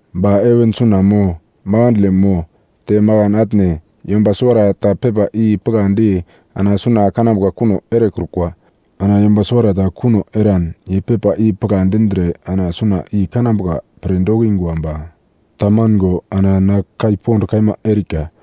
Ba heven suna mo makandle mo te makan atne yomba suwarata pepa i pigladi ana suna kanambuka kuno erekrukwa. Ana yomba suwarata kuno eran ye pepa i pigla dindre ana suna i kanambuka pre dokingwa ba tamango ana na kai pond kaima erika.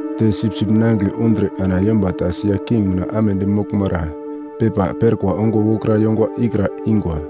Te Sipsip Nangigle undre ana yomba ta sia king mina amedi moglmara pepa perkwa ongo wokra yongwa ikra ingwa.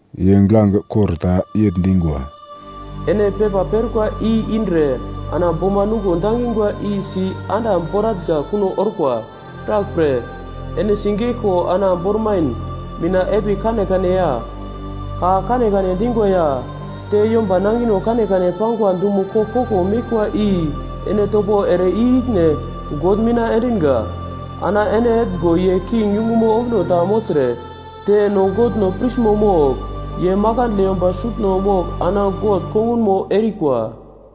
Ye giglange kor ta yegl dingwa, “Ene pepa perkwa i indre ana boma nuglo dangingwa i si anda boratnga kuno orkwa. Sraglpre, ene sigeglko ana bormain mina epigl kanekane ya ka kanekane dingwa ya te yomba nangino kanekane pangwa dumo koglkoglo meglkwa i ene topo ere i-ikine God mina endinga. Ana ene etngo ye king yungumo ombuno ta mogltre te no Godno prismo mogl. Ye makandle yomba sutno mogl ana God kongunmo erikwa.”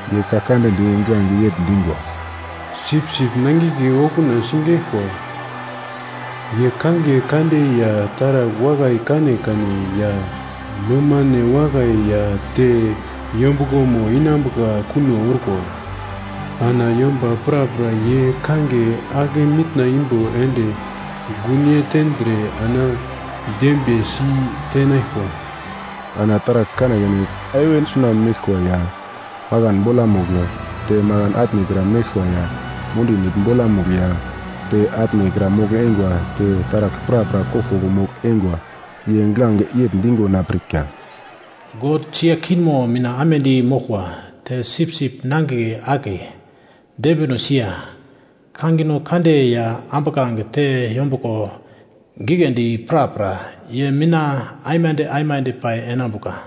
Ye ka kande di giglange yegl dingwa: “Sipsip Nangigle okuna sigeglkwa. Ye kangiye kande ya taragl wakai kanekane ya nomane wakai ya te yombuglomo inambuka kuno orkwa. Ana yomba prapra ye kangiye ake mitna imbo ende gunyei tendre ana dembiye si tenaglkwa.” Ana taragl kanekane heven suna meglkwa ya makan bolamugl te makan atnekra meglkwa ya mundi nigl bolamugl ya te atnekra mogl-eingwa te taragl prapra koglkoglo mogl-eingwa ye giglange yegl digo na pirka: “God sia kingmo mina amedi moglkwa, te Sipsip Nangigle akiye, dembinosi ya kangino kande ya ambuglange te yombuglo giglendi prapra, ye mina aimande aimande pai enambuka.”